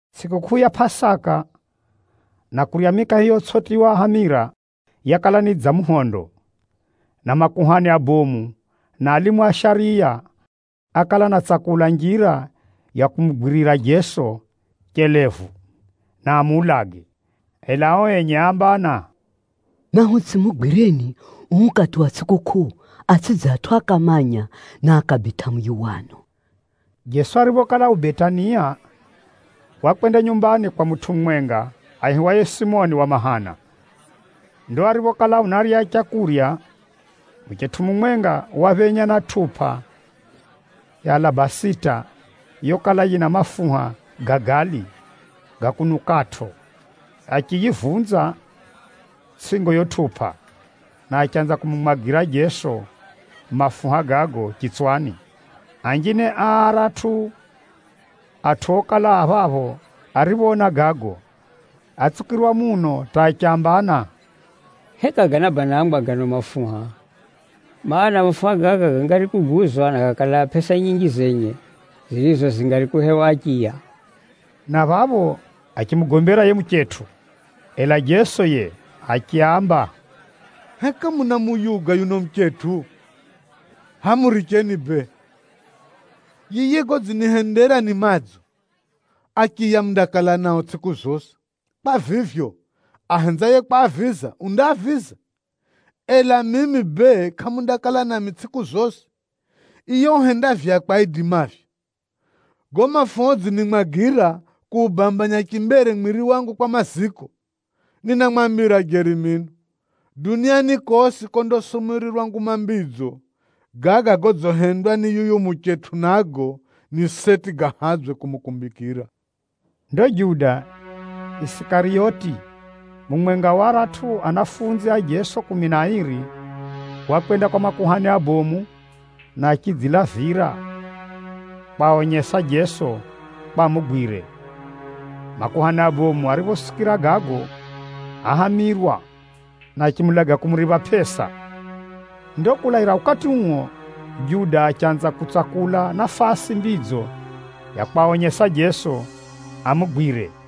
Tsʼikukʼuu ya Pʼasaka na kurya mikahe yotsʼitiywa hamira yakala ni dza muhondo, na makuhani abomu na alimu a shariya, ákala anatsakula njira ya kumugwirira Jeso chelevu, na amuulage. Ela ao enye áambana, “Nahutsʼimugwireni uu ukati wa tsʼikukʼuu, atsʼidze atʼu akamanya, na akabitʼa muyuwano.” Jeso ariphokala yukuko Betania, wakwenda nyumbani kwa mutʼu mumwenga aihiwaye Simoni wa mahana. Ndo ariphokala unarya leu, muchetʼu mumwenga waphenya na tʼupa ya alabasita yokala yina mafuha ga gali, ga kunukʼatʼo. Achiyivunza tsʼingo yiyo tʼupa, na achanza kumumwagira Jeso mafuha gago chitswani. Anjine a aratʼu atʼu okala a phapho ariphoona gago, átsukirwa muno hata achambana, “Heka ganabanangwa gano mafuha? Maana, mafuha gaga gangari kuguzwa na gakalaa pʼesa nyinji zenye, zirizo zingari kuhewa achiya.” Na phapho achimugombera yiye muchetʼu. Ela Jeso yiye achiaamba, “Heka munamuyuga yuno muchetʼu? Hʼaya muricheni bee! Yiye godzinihendera ni madzo. Achiya mundakala nao tsʼiku zosi. Kwa vivyo, ahenzaye kwaaviza, undaaviza, ela mimi bee, kʼamundakala nami tsʼiku zosi. Yiye uhenda vyakwe aidimavyo. Gago mafuha udzinimwagira, kuubambanya chimbere mwiri wangu kwa maziko. Ninamwambira jeri mino, duniani kosi kondasumurirwa Nguma Mbidzo, gaga godzihendwa ni yuyu muchetʼu nago, ni seti gahadzwe kumukumbikira.” Ndo Juda Isikariyoti, mumwenga wa aratʼu ahumwa a Jeso kumi na airi wakwenda kwa makuhani abomu, na achidzilavira kwaonyesa Jeso kwa amugwire. Makuhani abomu ariphosikira gago áhamirwa, na achimuulaga kumuripha pʼesa. Ndo kulaira ukati uo, Juda achanza kutsakula nafasi mbidzo ya kwaonyesa Jeso amugwire.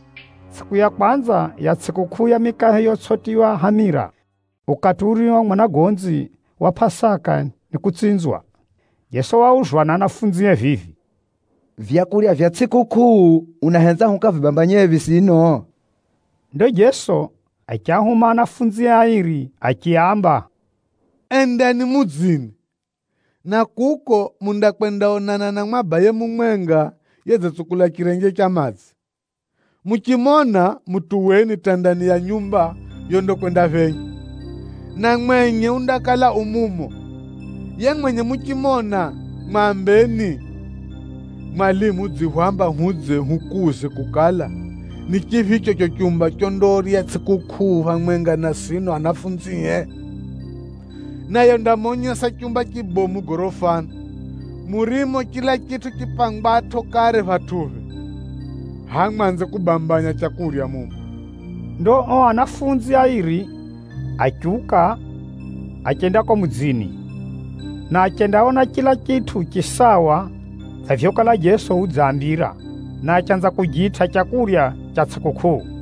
Tsʼiku ya kwanza ya tsʼikukʼuu ya mikahe yotsʼitiywa hamira, ukati urio mwanagonzi wa Pʼasaka nikutsinzwa, Jeso wauzwa ni ahumwae vivi, “Vyakurya vya tsʼikukʼuu, unahenza hukavibambanyephi sino?” Ndo Jeso achiahuma ahumwae airi achiaamba, “Endani mudzini, na kuko mundakwendaonana na mwabaye mumwenga yedzitsukula chirenje cha madzi. Muchimona, mutuweni hata ndani ya nyumba yondakwendaphenya, na mwenye undakala yu mumo. Yiye mwenye muchimona, mwambeni, ‘Mwalimu udzihwamba hudze hukuuze kukala, ni chiphicho chicho chumba chondarya tsʼikukʼuu phamwenga na sino ahumwae?’ Naye undamonyesa chumba chibomu gorofani, murimo chila chitʼu chipangwatʼo kare phatʼuphe. Hʼaya mwanze kubambanya leu mumo.” Ndo ao ahumwa airi achiuka, achenda kuko mudzini, na achendaona chila chitʼu chisawa dza vyokala Jeso udziaambira, na achanza kujitʼa leu ra tsʼikukʼuu.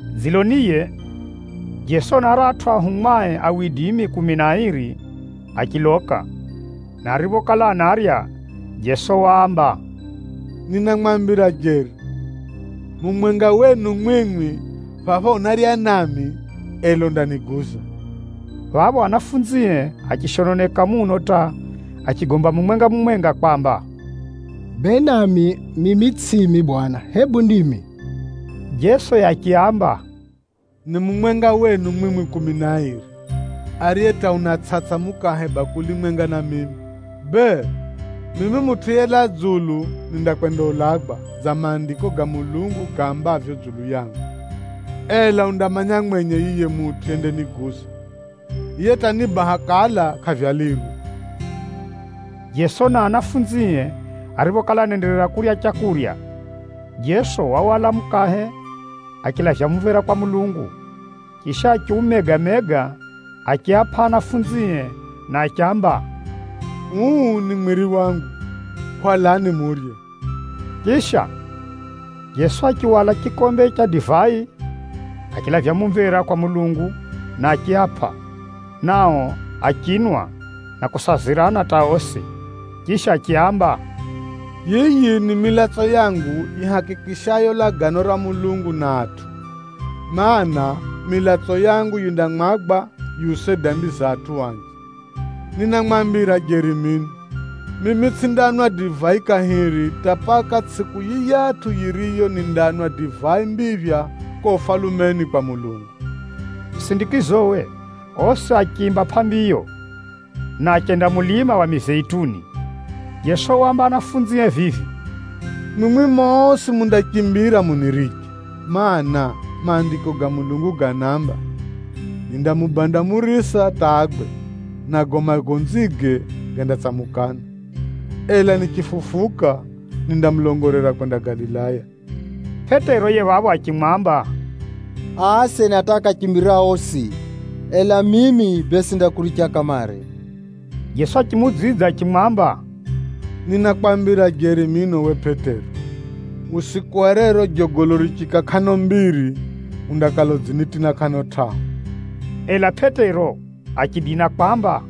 Dziloniye, Jeso na aratʼu ahumwae kumi na airi achiloka. Na ariphokala anarya, Jeso waamba, “Ninamwambira jeri, mumwenga wenu mwimwi phapha unarya nami, ela undaniguza.” Phapho ahumwae achishononeka muno hata achigomba mumwenga-mumwenga kwamba, “Bee nami mimi tsʼimi Bwana, hebu ndimi?” Jeso yiye achiaamba, “Ni mumwenga wenu mwimwi kumi na airi, ariye hata unatsʼatsʼa mukahe bakuli mwenga na mimi. Bee, mimi Mutʼu yelaa dzulu nindakwendaulagwa dza Maandiko ga Mulungu gaambavyo dzulu yangu. Ela undamanya mwenye yiye mutʼu yendaniguza. Yiye hata ni baha kala kʼavyalirwe!” Jeso na ahumwae ariphokala anaenderera kurya leu, Jeso wahwala mukahe achilavya mumvera kwa Mulungu, chisha achiumega-mega achiapʼa ahumwae na achiamba, “Uu ni mwiri wangu, hwalani murye.” Chisha, Jeso achihwala chikombe cha divai, achilavya mumvera kwa Mulungu na achiapʼa, nao achinwa na kusazirana hata osi. Chisha achiaamba, “Yiyi ni milatso yangu yihakikishayo Lagano ra Mulungu na atʼu, mana, milatso yangu yindamwagwa yiuse dambi za atʼu anji. Ninamwambira jeri mino, mimi tsʼindanwa divai kahiri, hata paka tsʼiku yiyatʼu yiriyo nindanwa divai mbiphya kuko Ufalumeni kwa Mulungu.” Musindikizowe osi achiimba pʼambiyo, na achenda mulima wa Mizeituni. Jeso waamba ahumwae vivi, “Mwimwi mosi mundachimbira muniriche. Maana, Maandiko ga Mulungu ganaamba, ‘Nindamupiga murisa hata agwe, nago magonzige gandatsamukana.’ “Ela nichifufuka, nindamulongolera kwenda Galilaya.” Pʼetero yiye phapho achimwamba, “Aa asena hata akachimbira osi, ela mimi bee, tsʼindakuricha kamare!” Jeso achimuudzidza achimwamba, “Ninakwambira jeri mino uwe Pʼetero, usiku wa rero jogolo richiika kʼano mbiri, undakala udzinitina kʼano tʼahu.” Ela Pʼetero achidina kwamba,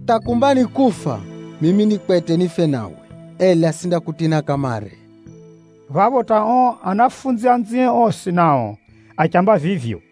“Hata kumba ni kufa, mimi ni kwete nife nawe, ela tsʼindakutina kamare!” Phapho hata ao ahumwa anzie osi nao achiamba vivyo.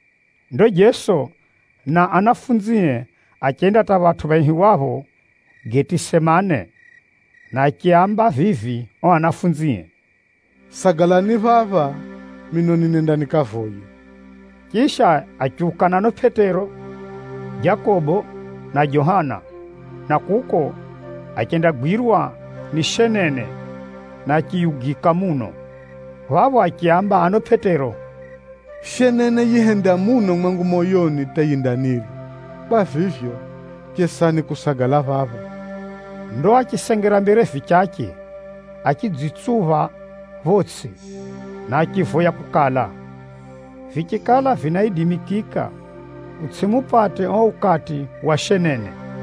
Ndo Jeso na ahumwae achenda hata phatʼu phaihiwapho Getisemane, na achiaamba vivi ao ahumwae, “Sagalani phapha mino ninenda nikavoye.” Chisha achiuka na ano Pʼetero, Jakobo, na Johana, na kuko achendagwirwa ni shenene na achiyugika muno. Phapho achiaamba ano Pʼetero, “Shenene yihenda muno mwangu moyoni hata yindanirya. Kwa vivyo, chesani kusagala phapha.” Ndo achisengera mbere vichache, achidzitsupha photsʼi na achivoya kukala, vichikala vinaidimikika utsʼimupate uo ukati wa shenene.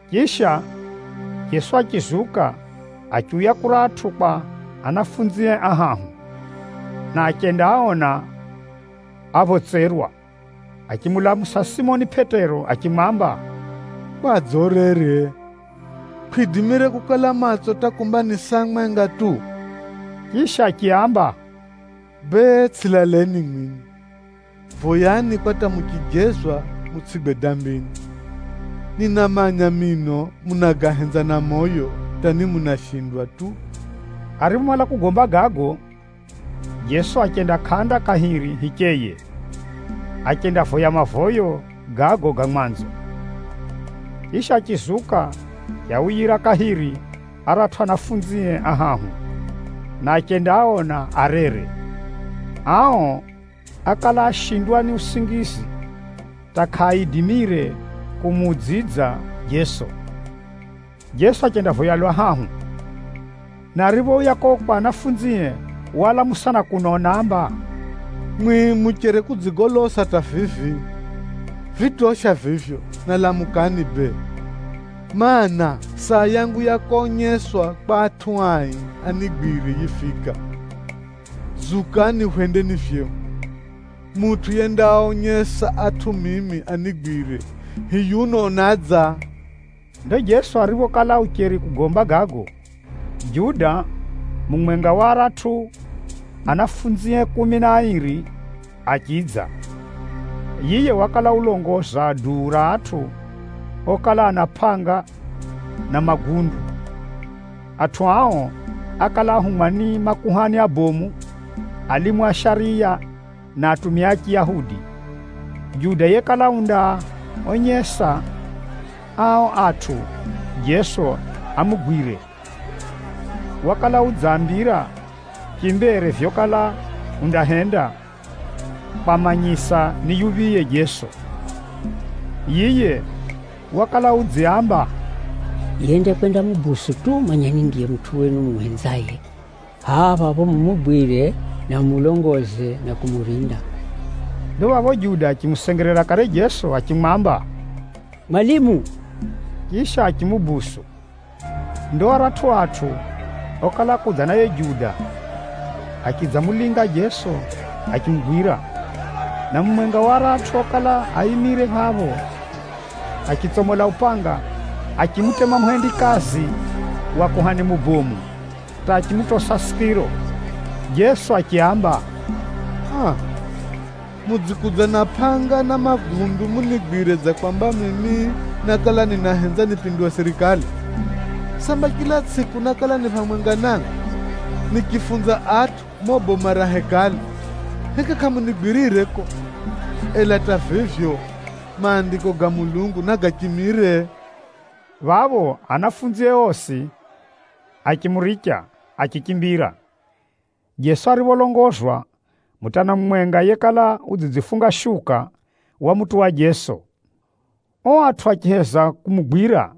Chisha, Jeso achizuka achiuya kuratʼu kwa ahumwae ahahu, na achendaaona aphotserwa. Achimulamusa Simoni Pʼetero achimwamba, “Kwadze urere? Kwʼidimire kukala matso hata kumba ni saa mwenga tu?” Chisha achiaamba, “Bee, tsʼilaleni mwimwi, voyani kwa hata muchijezwa mutsʼigwe dambini. Ninamanya mino, munagahenza na moyo hata ni munashindwa tu.” Ariphomala kugomba gago, Jeso achenda kʼanda kahiri hicheye, achendavoya mavoyo gago ga mwanzo. Chisha, achizuka achiauyira kahiri aratʼu ahumwae ahahu, na achendaaona arere. Ao ákala ashindwa ni usingizi, hata kʼaaidimire kumuudzidza Jeso. Jeso achendavoya lwa hahu, na ariphouya kuko kwa ahumwae, waalamusa na kuno unaamba, “Mwimwi mucheri kudzigolosa hata vivi? Vitosha vivyo, na lamukani bee, mana, saa ya mimi Mutʼu yelaa dzulu konyeswa kwa adambi anigwire, yifika. Zukani hwendeni vyehu. Mutʼu yendaaonyesa atʼu mimi anigwire, hiyuno unadza.” Ndo Jeso ariphokala ucheri kugomba gago, Juda, mumwenga wa aratʼu ahumwae kumi na airi, achidza. Yiye wakala ulongoza duu ra atʼu okala ana pʼanga na magundu. Atʼu ao ákala ahumwa ni makuhani abomu, alimu a shariya na atumia a Chiyahudi. Juda yekala undaaonyesa ao atʼu Jeso amugwire, wakala udziaambira chimbere vyokala undahenda kwamanyisa ni yuphiye Jeso. Yiye wakala udziaamba, “Yendakwendamudonera tu, manyani ndiye mutʼu wenu mumuhenzaye, hʼaya phapho mumugwire na mumulongoze na kumurinda.” Ndo phapho Juda achimusengerera kare Jeso achimwamba, “Mwalimu!” Chisha achimudonera. Ndo aratʼu atʼu okala akudza na yiye Juda, achidzamulinga Jeso achimugwira. Na mumwenga wa aratʼu okala aimire phapho, achitsomola upangawe, achimutema muhendikazi wa kuhani mubomu hata achimutosa sikiro. Jeso achiaamba, “Aa! Mudzikudza na pʼanga na magundu munigwire dza kwamba mimi nákala ninahenza nipinduwe sirikali? Samba chila tsʼiku nákala ni phamwenga namwi, nichifunza atʼu mumo boma ra Hekalu? Heka kʼamunigwirire kuko? Ela hata vivyo, Maandiko ga Mulungu nagachimire.” Phapho, ahumwae osi achimuricha, achichimbira. Jeso aripholongozwa, mutana mumwenga, yekala udzidzifunga shuka, wamutuwa Jeso. Ao atʼu achiheza kumugwira,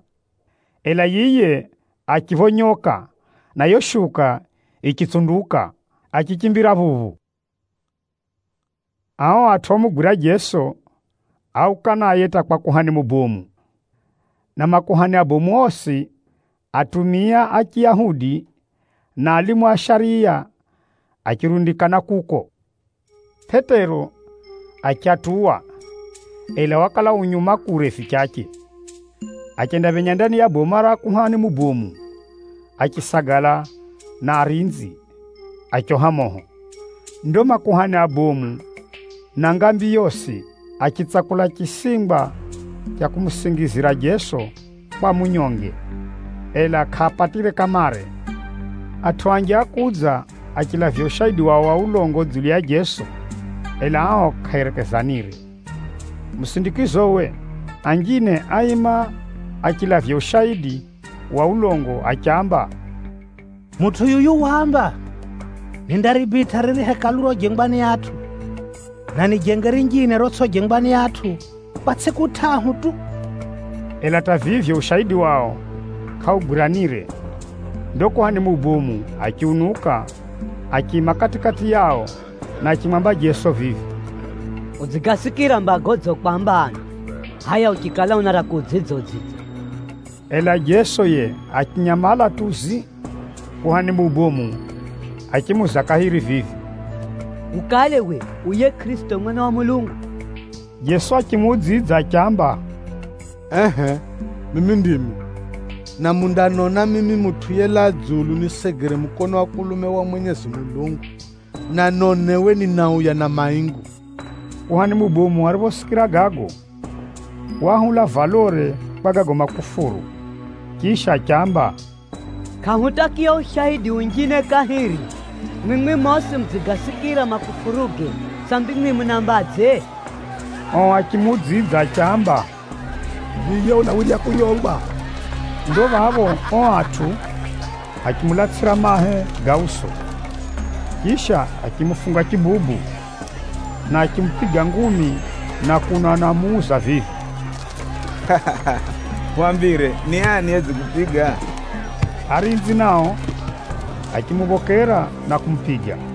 ela yiye achiphonyoka na yiyo shuka yichitsunduka, achichimbira phuphu. Ao atʼu omugwira Jeso, áuka naye hata kwa kuhani mubomu. Na makuhani abomu osi, atumia a Chiyahudi, na alimu a shariya achirundikana kuko. Pʼetero achiatuwa, ela wakala u nyuma kure vichache. Achendaphenya ndani ya boma ra kuhani mubomu, achisagala na arinzi, achoha moho. Ndo makuhani abomu na ngambi yosi achitsakula chisingwa cha kumusingizira Jeso kwa amunyonge, ela kʼaapatire kamare. Atʼu anji ákudza achilavya ushaidi wao wa ulongo dzulu ya Jeso, ela ao kʼaaerekezanire. Musindikizowe, anjine áima achilavya ushaidi wa ulongo achiamba, “Mutʼu yuyu waamba, ‘Nindaribitʼa riri Hekalu rojengwa ni atʼu, na nijenge rinjine rotsʼijengwa ni atʼu, kwa tsʼiku tʼahu tu.’” Ela hata vivyo, ushaidi wao kʼaugwiranire. Ndo kuhani mubomu achiunuka, achiima kati-kati yao na achimwamba Jeso vivi, “Udzigasikira mba godzikwamba ano, hʼaya uchikala una ra kuudzidza, udzidza.” Ela Jeso yiye achinyamala tu zii. Kuhani mubomu achimuuza kahiri vivi, “Ukale uwe u yiye Kʼirisito, Mwana wa Mulungu?” Jeso achimuudzidza achiamba, “Ehʼe mimi ndimi. Na mundanona mimi Mutʼu yelaa dzulu nisegere mukono wa kulume wa Mwenyezi Mulungu na ni mainguni ninadza.” Kuhani mubomu ariphosikira gago, waahula valore kwa gago makufuru. Chisha achiamba, “Kʼahutakiya ushaidi unjine kahiri! Mwimwi mosi mudzigasikira makufuruge! Sambi mwimwi munaambadze?” Ao achimuudzidza achiamba, “Yiye unawirya kunyongwa!” Ndo phapho ao atʼu achimulatsʼira mahe ga uso. Chisha achimufunga chibubu, na achimupiga ngumi na kuno anamuuza vivi, “Hwambire, ni ani yedzikupiga?” Arinzi nao, achimuphokera na kumupiga.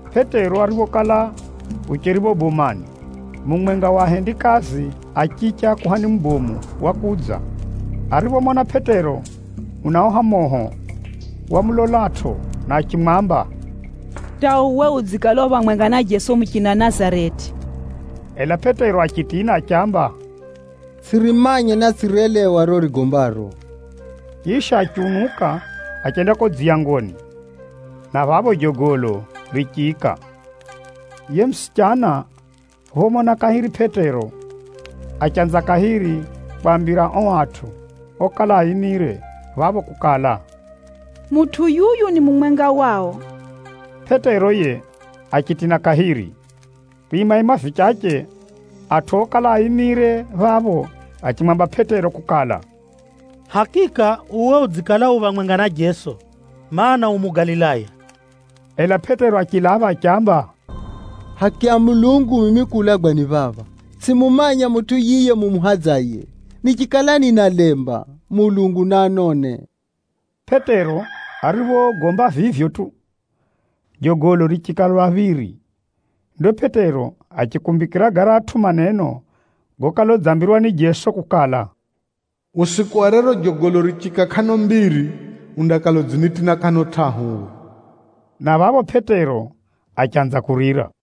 Pʼetero ariphokala ucheri phapho bomani, mumwenga wa ahendikazi a chiche a kuhani mubomu wakudza. Ariphomona Pʼetero unaoha moho, wamulolatʼo na achimwamba, “Hata uwe udzikala u phamwenga na Jeso muchina Nazareti!” Ela Pʼetero achitina achiamba, “Tsʼirimanya na tsʼirelewa riro urigombaro!” Chisha achiunuka achenda kuko dziyangoni, na phapho jogolo richiika. Yiye musichana phomona kahiri Pʼetero, achanza kahiri kwaambira ao atʼu okala aimire phapho kukala, “Mutʼu yuyu ni mumwenga wao!” Pʼetero yiye achitina kahiri. Kwimaima vichache, atʼu okala aimire phapho achimwamba Pʼetero kukala, “Hakika uwe udzikala u phamwenga na Jeso, mana, u Mugalilaya.” Ela Pʼetero achilapha achiamba, “Haki ya Mulungu mimi kuulagwa ni phapha, tsʼimumanya mutʼu yiye mumuhadzaye! Nichikala ninalemba, Mulungu naanone!” Pʼetero ariphogomba vivyo tu, jogolo richiika lwa phiri. Ndo Pʼetero achikumbikira garatʼu maneno gokala udzambirwa ni Jeso kukala, “Usiku wa rero jogolo richiika kʼano mbiri, undakala udzinitina kʼano tʼahu uwe.” Na phapho Pʼetero achanza kurira.